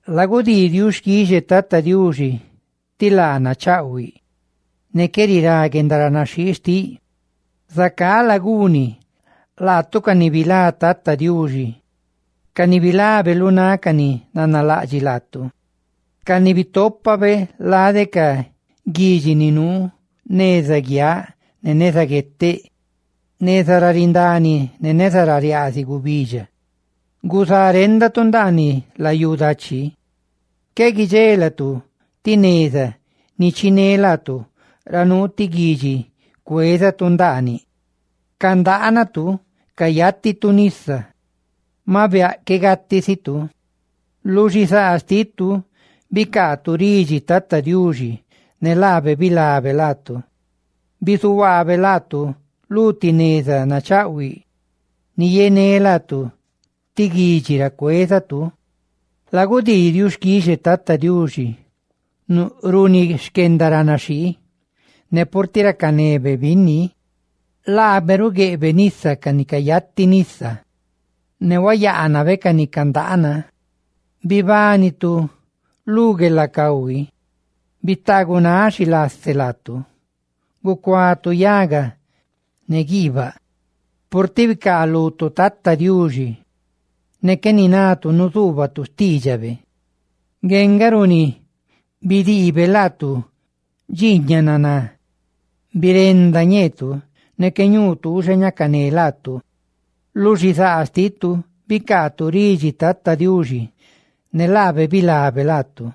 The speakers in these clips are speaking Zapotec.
Lagudii xquixe Tata Diuxi ti laa nachaꞌhuiꞌ, ne qué rirá guendaranaxhii xtiꞌ. Zacá laguiniꞌ, laatu, ca ni bilá Tata Diuxi, ca ni bilabe lu náꞌ ca ni nanalaꞌdxiꞌ laatu, ca ni bitópabe lade ca guidxi ni nuu neza guiaꞌ ne neza gueteꞌ, neza ra rindani ne neza ra riaaziꞌ gubidxa. Guzá réndatu ndaaniꞌ layú dachi, qué guidxela gatu ti neza ni chiné laatu ra nuu ti guidxi cuézatu ndaaniꞌ; candaanatu, cayátitu nisa, ¡maꞌ biaꞌ qué gatisitu! Lu xizaa xtitu bicaatu ridxi Tata Diuxi, ne laabe bilabe laatu. Bizuhuaabe laatu lu ti neza nachaꞌhuiꞌ ni yené laatu lu ti guidxi ra cuézatu. Lagudii xquixe Tata Diuxi runi xquendaranaxhii, ¡ne purtiꞌ racanebe binni! Laabe rugueꞌbe nisa ca ni cayati nisa, ne ruyaanabe ca ni candaana. Bibánitu lu guelacahui, bitaagunáꞌ xilase laatu, gucuatu yaga ne guiibaꞌ, purtiꞌ bicaalutu Tata Diuxi, ne qué ninatu nuzuubatu xtiidxabe. Ngue nga runi bidiibe laatu dxiiñaꞌ naná; birenda ñeetu, ne qué ñuu tuuxa ñacané laatu. Lu xizaa xtitu bicaatu ridxi Tata Diuxi, ne laabe bilabe laatu;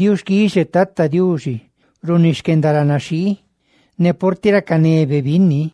Lagudii xquixe Tata Diuxi runi xquendaranaxhii, ¡ne purtiꞌ racanebe binni!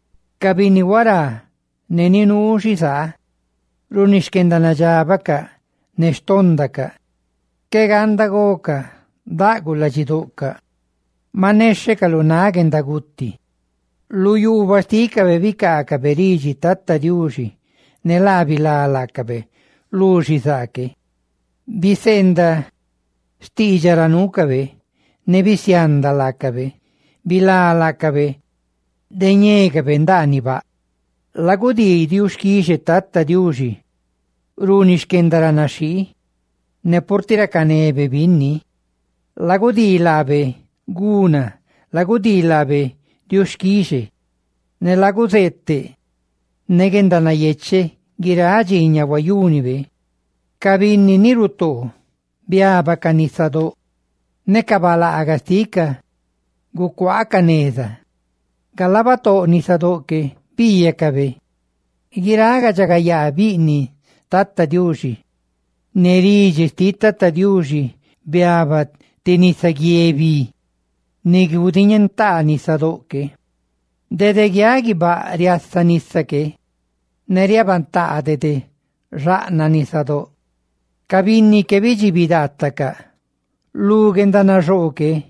Ca binni huará ne ni nuu xizaa runi xquendanadxábacaꞌ ne xtóndacaꞌ, qué ganda gocaꞌ, daꞌguꞌ ladxidoꞌcaꞌ; ¡maꞌ nexhecaꞌ lu náꞌ guendaguti! Lu yuubaꞌ xtícabe bicaacabe ridxi Tata Diuxi, ne laa bilá laacabe lu xizaa que; biseendaꞌ xtiidxaꞌ ra nuucabe ne bisianda laacabe; ¡bilá laacabe de ñécabe ndaaniꞌ baꞌ! Lagudii xquixe Tata Diuxi runi xquendaranaxhii, ¡ne purtiꞌ racanebe binni! Lagudii laabe guna, lagudii laabe xquixe ne laguzeeteꞌ ne guendanayecheꞌ guiráꞌ dxiiñaꞌ huayúnibe. Ca binni ni rutoo biábacaꞌ nisadóꞌ. Ne ca balaagaꞌ xticaꞌ gucuaacaꞌ neza, galaa batóꞌ nisadóꞌ que, biiyacabe guiráꞌ guendaridxagayaa bizáꞌ Tata Diuxi. Ne ridxi xtiꞌ Tata Diuxi biaba ti nisaguié bi ni gudiñentaa nisadóꞌ que; dede guiaꞌ guibáꞌ riasa nisa que, ne riabantaa dede xaꞌnaꞌ nisadóꞌ; ¡ca binni que bidxibi daatacaꞌ lu guendanaxoo que!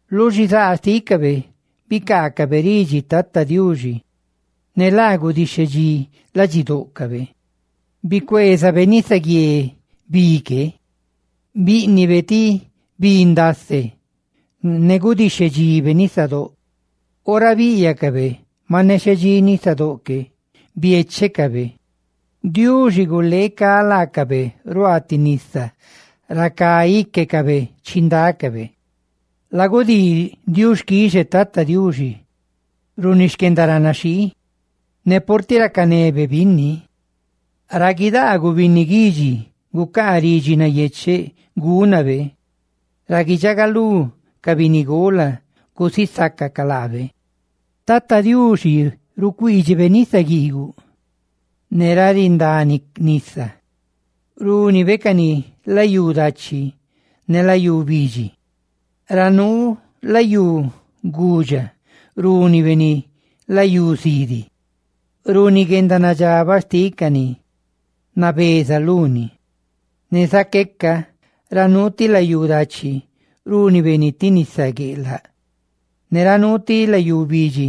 Lu xizaa xtícabe bicaacabe ridxi Tata Diuxi, ne laa gudixhe dxí ladxidóꞌcabe; bicueezabe nisaguié bi que, bíꞌnibe ni ti bi ndase, ne gudixhedxibe nisadóꞌ. Ora bíꞌyacabe nexhe dxí nisadóꞌ que, biéchecabe, Diuxi guleecá laacabe ruaa ti nisa ra cá íquecabe chindácabe. Lagudii xquixe Tata Diuxi runi xquendaranaxhii, ¡ne purtiꞌ racanebe binni! ¡Ra guidaaguꞌ binni guidxi, gucaa ridxi nayecheꞌ gúnabe! ¡Ra guidxagalú ca binnigola gusisácacaꞌ laabe! Tata Diuxi rucuiidxiꞌ nisa guiiguꞌ, ne ra rindani nisa, rúnibe cani layú dachi ne layú bidxi; ra nuu layú gudxa rúnibe ni layú zidi, runi guendanadxabaꞌ xtiꞌ ca ni nabeza luni; ne zaqueca ra nuu ti layú dachi rúnibe ni ti nisa gueꞌlaꞌ ne ra nuu ti layú bidxi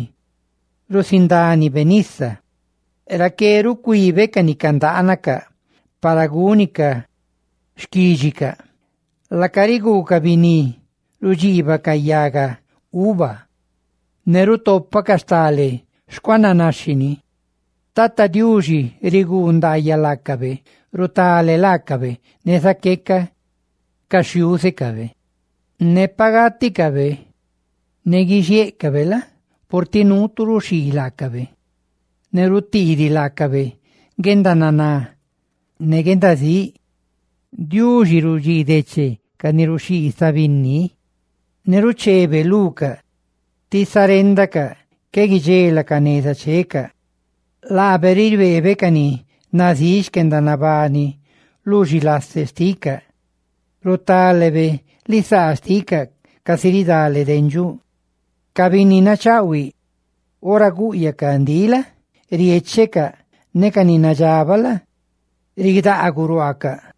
rusindánibe nisa; raqué rucuibe ca ni candaanacaꞌ, para gúnicaꞌ xquídxicaꞌ. Laacaꞌ riguucaꞌ biní, rudxiibacaꞌ yaga uva, ne rutopacaꞌ stale xcuaananaxhini. Tata diuxi riguu ndaayaꞌ laacabe, rutale laacabe, ne zaqueca ca xhiúzecabe. Ne pa gáticabe ne guixiéꞌcabe la? purtiꞌ nuu tu ruxhii laacabe, ne rutiidiꞌ laacabe guendananá ne guendazíꞌ, Diuxi rudxii deche ca ni ruxhii binni, ne ruchebe lucaꞌ ti za réndacaꞌ, qué guidxelacaꞌ neza checaꞌ. Laabe ribeebe ca ni nazíꞌ xquendanabani lu xilase xticaꞌ; ¡rutálebe lisaa xticaꞌ casi ridale dendxuꞌ! Ca binni nachaꞌhuiꞌ, ora gúꞌyacaꞌ ndiꞌ la? riéchecaꞌ, ne ca ni nadxabaꞌ la? ridaaguꞌ ruaacaꞌ.